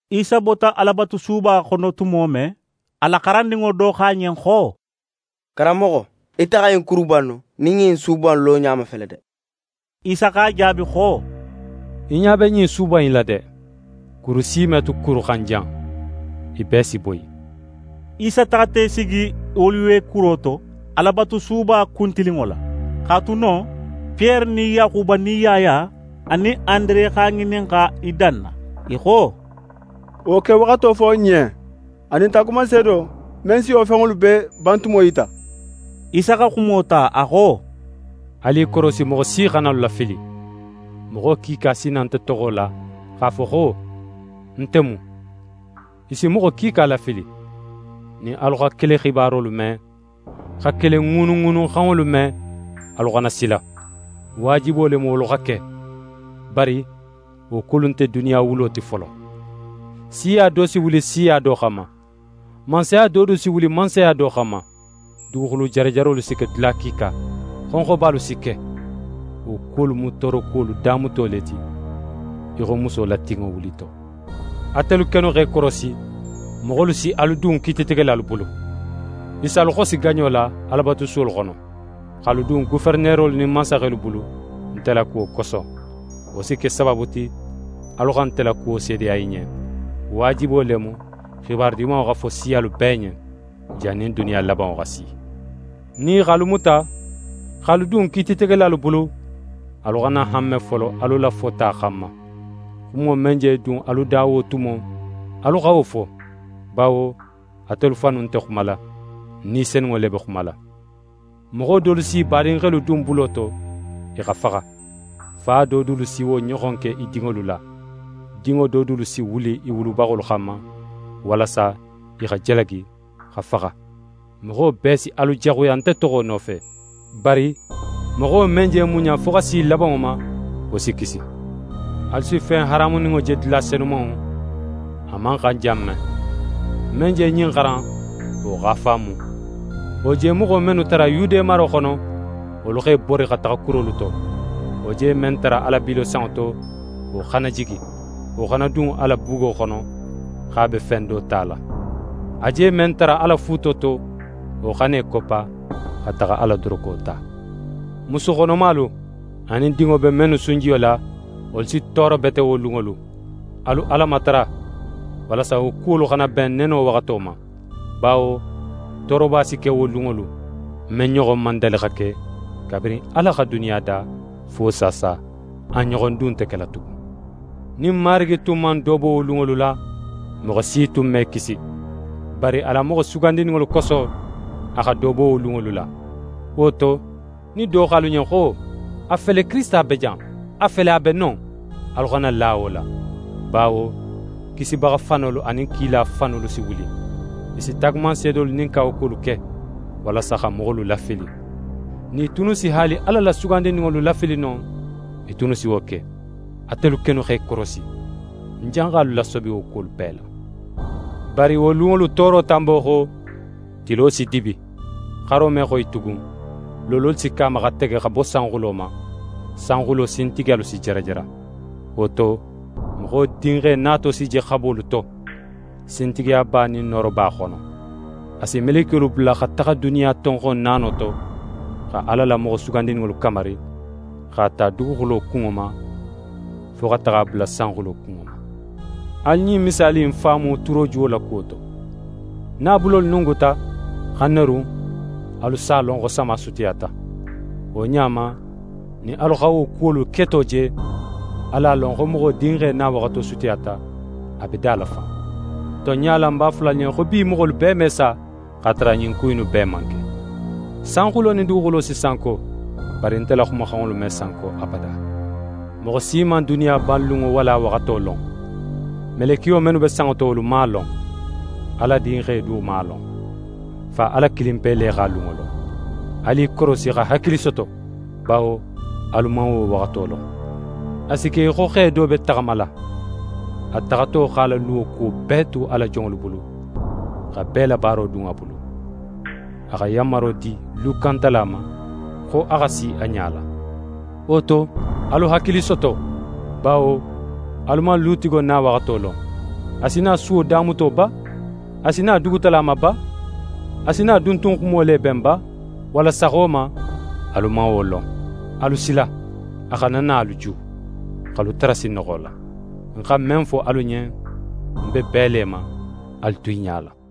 Isa bota Alabatusuba xono tumo men, a la xarandinŋo do xo a ɲen xo: «Karanmoxo, ite xa ɲin kuruba innu nin ɲin su in loɲa mafele de!» Isa x'a jaabi xo: «Í ɲa be ɲin suba innu la de! Kuru si me tu kuru xan jan, i bee si boyi.» Isa taxata í sigi Oliwe kuro to, Alabatusuba kuntilinŋo la. X'a tu non, Piyere nin Yaxuba nin Yaya anin Andere x'a ŋininxa i danna. I xo: «Wo kewaxato fo n ɲen, anin taagumanseedo, men si wo fenŋolu bee bantumo yita.» Isa xa xumo ta, a xo: «Alu i korosi moxo si xana alu lafili. Moxo kiika si na nte toxo la, x'a fo xo: “Nte mu.” I si moxo kiika lafili. Nin alu xa kele xibarolu me, xa kele ŋuunuŋuunuxanŋolu me, alu xana sila. Waajibo le mu wolu xa ke, bari wo kuwolu nte duniya wulo ti folo. Siya do si wuli siya do xanma, mansaya do du si wuli mansaya do xanma. Duguxulu jarajarolu si ke dula kiika. Xonxobalu si ke. Wo kuwolu mu toorokuwolu damuto le ti, í xo muso la tinŋo wulito. «Atelu kennu x'e korosi; moxolu si alu dun kiititegelalu bulu. I si alu xosi gaɲo la Alabatusuwolu xono, x'alu dun goferenerolu nin mansaxelu bulu nte la kuwo koso. Wo si ke sabaabu ti, alu xa nte la kuwo seedeya i ɲen. Waajibo le mu, xibaru Dimanŋo xa fo siyalu bee ɲen, jannin duniya labanŋo xa si. Nin i x'alu muta, x'alu dun kiititegelalu bulu, alu xana hanme folo alu la fota xanma. Xumo men je dun alu da wo tumo, alu xa wo fo, bawo atelu fannu nte xumala; Ni Senunŋo le be xumala. Moxo dolu s'i badinxelu dun bulo to, i xa faxa. Fa do dulu si wo ɲoxon ke i dinŋolu la. Dinŋo do dulu si wuli i wulubaxolu xanma, walasa i xa jalagi, xa faxa. Moxo bee si alu jaxuya nte toxo nofe. Bari moxo men je muɲa fo xa si labanŋo ma, wo si kisi.» «Alu si fen haramuninŋo je dula Senumanŋo, a man xan jan men. Men je ɲin xaran, wo x'a faamu! Wo je moxo mennu tara Yude maro xono, wolu x'e bori xa taxa kurolu to. Wo je men tara a la bilo sanŋo to, wo xana jigi, wo xana dun a la bugo xono, x'a be fen do tala. A je men tara a la fuuto to, wo xana í koppa xa taxa a la doroko ta. Musu xonomalu, anin dinŋo be mennu sunjiyo la, wolu si tooro bete wo lunŋolu. Alu Ala matara, walasa wo kuwolu xana ben neno waxato ma. Bawo tooroba si ke wo lunŋolu, men ɲoxon man dali xa ke, kabirin Ala xa duniya da, fo saasa. A ɲoxon du nte kela tugun. Nin Marigi tun man do bo wo lunŋolu la, moxo si tun me kisi. Bari a la moxo sugandininŋolu koso, a xa do bo wo lunŋolu la. Wo to, nin do xo alu ɲen xo: “A fele, Kirisita be jan! A fele, a be non”, alu xana la wo la. Bawo kisibaxa fanolu anin kila fanolu si wuli. I si taagumanseedolu nin kawakuwolu ke, walasa xa moxolu lafili. Nin i tunnu si haali Ala la sugandininŋolu lafili no, i tunnu si wo ke. Atelu kennu x'e korosi! Ń janxa alu lasobi wo kuwolu bee la.» «Bari wo lunŋolu tooro tanbo xo, tilo si dibi, xaro me xoyi tugun, loololu si ke a ma xa tege xa bo sanxulo ma, sanxulo sintigiyalu si jarajara. Wo to, Moxo Dinxe nato si je xabolu to, sintigiyaba nin nooroba xono. A si melekiyolu bula xa taxa duniya tonxon naano to, xa Ala la moxo sugandininŋolu kamari, x'a ta duguxulo kunŋo ma, fo xa taxa a bula sanxulo kunŋo ma. «Alu ɲin misaali in faamu turojuwo la kuwo to: Nin a bulolu nunguta, xa nerun, alu s'a lon xo sama sutiyata. Wo ɲa ma, nin alu xa wo kuwolu keto je, alu a lon xo Moxo Dinxe nawaxato sutiyata, a be da la fan. Tonɲa la, ń b'a fola alu ɲen, xo bi moxolu bee me sa, x'a tara ɲin ku innu bee man ke. Sanxulo nin duguxulo si sanko, bari nte la xumaxanŋolu me sanko abada.» «Moxo si man duniya banlunŋo, walla a waxato lon. Melekiyo mennu be sanŋo to, wolu man a lon, Ala Dinxe du man a lon. Fa Ala kilinpe le x'a lunŋo lon. Alu i korosi, xa hakili soto, bawo alu man wo waxato lon. A si ke í xo xe do be taxamala. A taxato x'a la luwo kuwo bee tu a la jonŋolu bulu, xa bee la baaro dun a bulu. A xa yanmaro di lukantala ma, xo a xa si a ɲala. Wo to, alu hakili soto, bawo alu man lutigo nawaxato lon. A si na suwo damuto ba, a si na dugutala ma ba, a si na duntunxumo le ben ba, walla saxo ma, alu man wo lon. Alu sila, a xana na alu ju, x'alu tara sinnoxo la. Ń xa men fo alu ɲen, ń be bee le ma: “Alu tu i ɲala.”»